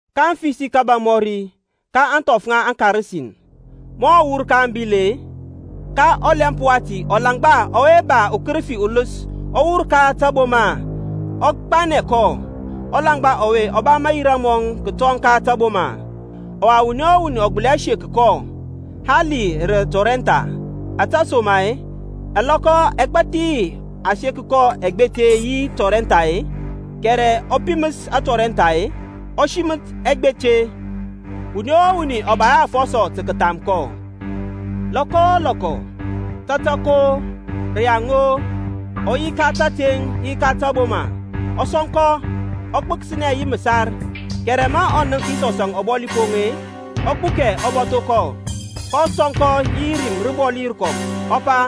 kaŋ fəsi kȧbȧŋ mɔri, ka ȧŋthɔf ŋa aŋKarasin. Ma ɔ wur ka ȧŋbil-e, ka ɔlɛmp wati ulaŋgba ɔwe ba ukərəfi uləs ɔ wur ka taboma ɔ gbanɛ kɔ. Ɔlaŋgba ɔwe ɔ ba mayira mɔŋ kətɔŋ ka taboma, ɔwa wuni o wuni ɔ gbəli hɛ sek kɔ, hali rə tɔrɛntha, ȧtesoma-e ɛlɔkɔ ɛgbathi a seka kɔ ɛgbete yi tɔrɛntha-e, kɛrɛ ɔ piməs atɔrɛntha-e, ɔ siməth ɛgbete. Wuni o wuni ɔ ba hɛ afɔsɔ tə kətham kɔ. Lɔkɔ o lɔkɔ, tatak-o, rəyaŋ-o, ɔ yi ka tȧteŋ yi ka taboma, ɔ sɔŋkɔ, ɔ gbəkəsnɛ yi məsarȧŋ. Kɛrɛ ma ɔ nənk Yisɔs ɔbɔli poŋ, ɔ gbukɛ ɔ bȧtho kɔ, kɔ sɔŋkɔ yi rim rəbɔli rəkɔm, ɔ pa,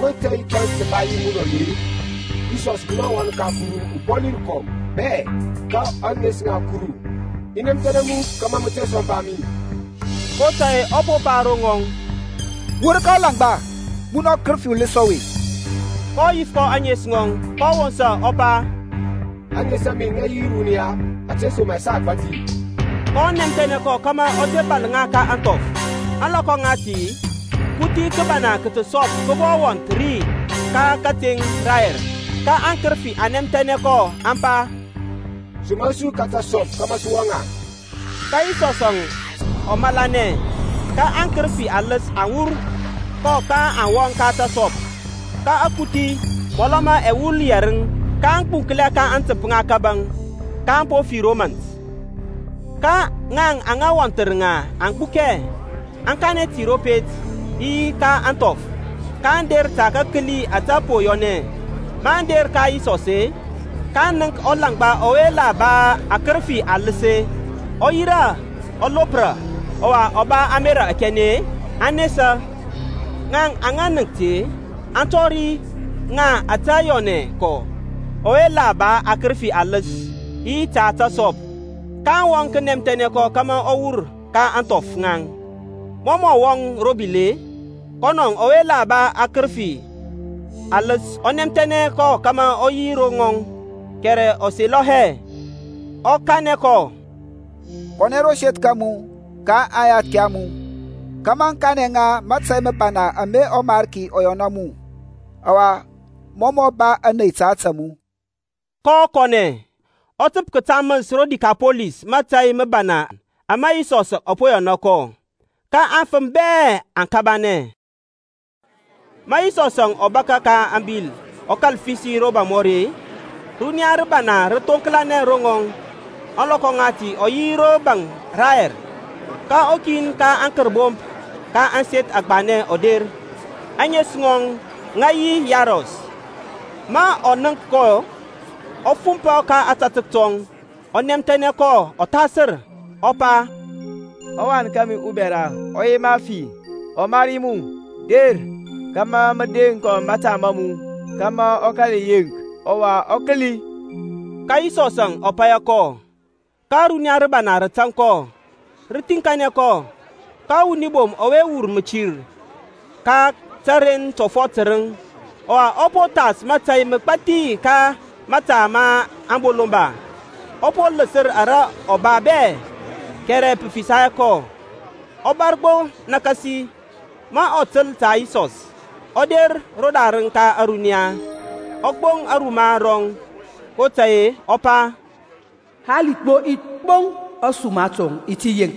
Ko tȧy tȧŋ i ba yi munɔ-e, Yisɔs munɔ ɔWan ka Kuru ɔBɔlirəkɔm bɛ-e? Ka ȧŋes ŋa Kuru, i nɛmthɛnɛ mu kȧmȧ mə te sɔmpa mi. kotȧy-e ɔ po pa ro ŋɔŋ, Wur ka ɔlaŋgba, munɔ ɔkərəfi uləs ɔwe. kɔ yif kɔ ȧŋes ŋɔŋ, kɔ wosa, ɔ pa, Aŋes a mi aŋ yi Runia, ȧtesoma-e sa agbȧthi. kɔ nɛmthɛnɛ kɔ kȧmȧ ɔ te bȧl ŋa ka ȧŋthɔf. Ȧŋlɔkɔ ŋati, kuthi kəbana ka təsɔp kə bɔ wɔnth ri ka kateŋ rayɛr. Ka aŋkərəfi aŋ nɛmthɛnɛ kɔ aŋ pa, Somra su ka tasɔp kȧmȧ sə wɔŋ ŋa. Ka Yisɔsȧŋ ɔ malanɛ. Ka aŋkərəfi aləs aŋ wur kɔ aŋ wɔŋ ka tasɔp, ka akuthi (mɔlɔ ma ɛwul yɛrəŋ) kə gbuŋklɛ ka aŋtəmp ŋa kȧbȧŋ, kaŋ po fi ro mȧnt. Ka ŋaŋ aŋa wɔnthər ŋa aŋ gbukɛ, aŋ kanɛ ti ro pet, yi ka ȧŋthɔf. Kaŋ der tə kəkəli ȧte po yɔnɛ. Maŋ der ka Yisɔs-e, kaŋ nənk ɔlaŋgba ɔwe la ba aŋkərəfi aləs-e, ɔ yirȧ, ɔ lopra, ɔwa ɔ ba ȧmerȧ akɛnɛ-e, aŋ nesa. Ŋaŋ aŋa nənk ti-e, aŋ tɔri ŋa ȧte yɔnɛ kɔ ɔwe la ba aŋkərəfi aləs, yi ta tasɔp. kaŋ wɔŋ kənɛmthɛnɛ kɔ kȧmȧ ɔ wur ka ȧŋthɔf ŋaŋ. Mɔ mɔ wɔŋ ro bil-e, kɔnɔ ɔwe la ba aŋkərəfi ɔ nɛmthɛnɛ kɔ kȧmȧ ɔ yi ro ŋɔŋ. Kɛrɛ ɔ selɔ hɛ, ɔ kanɛ kɔ, Kɔnɛ ro seth ka mu ka aŋyathki a mu, kȧmȧ mə kanɛ ŋa mȧtȧy məbana ama ɔMarki ɔ yɔna mu, ɔwa mɔ mɔ ba ȧney ta ȧtȧ mu. kɔ kɔnɛ, ɔ təp kətaməs ro Dikapɔlis mȧtȧy məbana ama Yisɔsȧŋ ɔ po yɔna kɔ. Ka aŋfəm bɛ aŋ kabanɛ. Ma Yisɔsȧŋ ɔ bȧkȧ ka ȧŋbil ɔ kȧl fəsi romɔri-e, runiya rəbana rə thoŋklanɛ ro ŋɔŋ. Ȧŋlɔkɔ ŋati ɔ yi ro baŋ rayɛr. Ka ukin ka aŋkərbomp ka ȧŋseth agbanɛ ɔ der, ȧŋes ŋɔŋ ŋə yi Yairɔs. Ma ɔ nənk kɔ, ɔ fumpɔ ka ȧtȧtək tɔŋ, ɔ nɛmthɛnɛ kɔ ɔthasər, ɔ pa, Ɔwan kȧmi ubɛra ɔ yema fi, ɔmari mu, der kȧmȧ mə deŋ kɔ mȧta ma mu, kȧmȧ ɔ kȧl yeŋk, ɔwa ɔ kəli. Ka Yisɔsȧŋ ɔ paya kɔ; ka ȧruniya rəbana rə tȧŋ kɔ, rə thiŋkanɛ kɔ. Ka wuni bom ɔwe wur mətir ka təren tɔfɔt tərəŋ, ɔwa ɔ po thas mȧtȧy məgbȧthi ka mȧta ma aŋbolomba, ɔ po ləsər ara ɔ ba bɛ, kɛrɛ pə fisa hɛ kɔ, ɔ bȧr gbo nakasi; ma ɔ təl ta Yisɔsȧŋ, ɔ der rodarəŋ ka ȧruniya, ɔ gboŋ aruma rɔŋ. kotȧy-e ɔ pa, Hali gbo i gboŋ ȧsuma tɔŋ i ti yeŋk.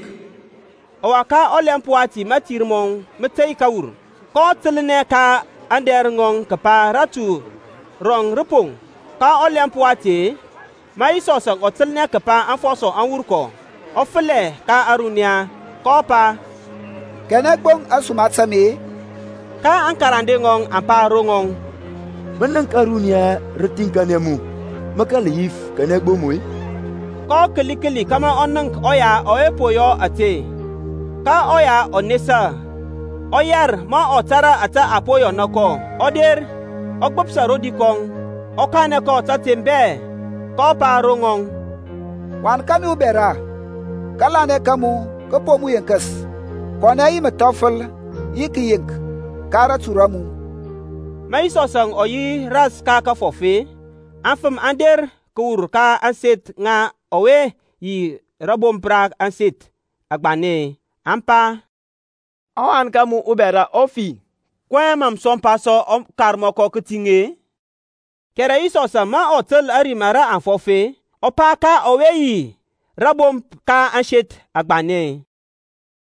Ɔwa ka ɔlɛmp wati mȧtir mɔŋ mə tey kəwur, kɔ təlnɛ ka aŋdɛr ŋɔŋ kəpa ratu rɔŋ rə poŋ. Ka ɔlɛmp wati-e, ma Yisɔsȧŋ ɔ təlnɛ kəpa aŋfɔsɔ aŋ wur kɔ, ɔ fəlɛ ka ȧruniya, kɔ pa, Kanɛ gboŋ ȧsuma ta mi-e? Ka aŋkarande ŋɔŋ aŋ pa ro ŋɔŋ, Mə nənk ȧruniya rə thiŋkanɛ mu, mə kȧl yif, Kanɛ gboŋ mi-e? kɔ kəli kəli kȧmȧ ɔ nənk ɔya ɔwe po yɔ ȧte. Ka ɔya ɔ nesa, ɔ yɛr ma ɔ tȧrȧ ȧtȧ a po yɔna kɔ, ɔ der, ɔ gbəpsa rodi kɔŋ, ɔ kanɛ kɔ tȧteŋ bɛ. kɔ pa ro ŋɔŋ, Wan kȧmi ubɛra, Kȧlanɛ ka mu kə po mu yenkəs. Kɔnɛ yi məthɔfəl yi kəyeŋk ka ratu ra mu. Ma Yisɔsȧŋ ɔ yi ras ka kəfɔf-e, afəm aŋ der kəwur ka ȧŋseth ŋa ɔwe yi rȧbomp ka ȧŋseth agbanɛ-e, aŋ pa, Ɔwan ka mu bɛra ɔ fi. Kɔyɛŋ mȧ mə sɔmpa sɔ ɔkarmɔkɔ kətiŋ-e? Kɛrɛ Yisɔsȧŋ ma ɔ təl ȧrim ara a fɔf-e, ɔ pa ka ɔwe yi rȧbomp ka ȧŋseth agbanɛ-e,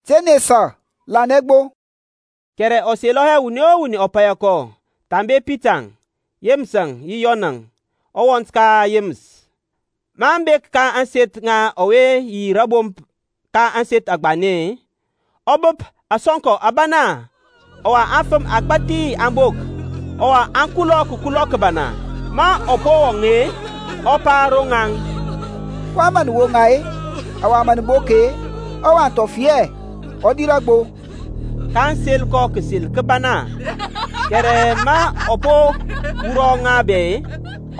Te nesa, lanɛ gbo. Kɛrɛ ɔ selɔ hɛ wuni o wuni ɔ paya kɔ, thambe Pitaŋ, Yeməsȧŋ yi Yɔnȧŋ, ɔwɔnt ka Yeməs. Maŋ bek ka ȧŋseth ŋa ɔwe yi rȧbomp ka ȧŋseth agbanɛ-e, ɔ bəp asɔnkɔ ȧbana, ɔwa afəm agbȧthi aŋ bok, ɔwa aŋ kulɔ kəkulɔ kəbana. Ma ɔ po wɔŋ-e, ɔ pa ro ŋaŋ, kɔyɛŋ mə nə woŋa-e, ɔwa nə bok-e? Ɔwath ɔ fi hɛ, ɔ dirȧ gbo. kaŋ sel kɔ kəsel kəbana. Kɛrɛ ma ɔ po wurɔ ŋa bɛ-e,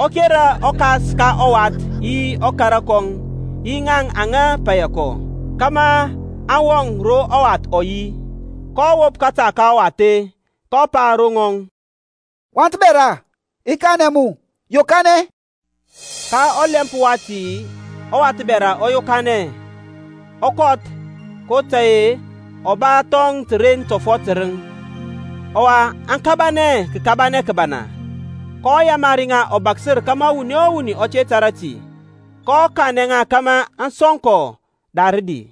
ɔ kera ɔkas ka ɔwath yi ɔkara kɔŋ, yi ŋaŋ aŋa paya kɔ, kȧmȧ aŋ wɔŋ ro ɔwath ɔ yi. kɔ wop kȧta ka ɔwath-e, kɔ pa ro ŋɔŋ, Wath bɛra, i kanɛ mu, Yokanɛ. Ka ɔlɛmp wati ɔwath bɛra ɔ yokanɛ, ɔ kɔth, kotȧy-e ɔ ba thɔŋ təren tɔfɔt tərəŋ. Ɔwa aŋ kabanɛ kəkabanɛ kəbana. kɔ yamari ŋa ɔbaksər kȧmȧ wuni o wuni ɔ te tȧrȧ ti. Kɔ kanɛ ŋa kȧmȧ aŋ sɔŋ kɔ da rədi.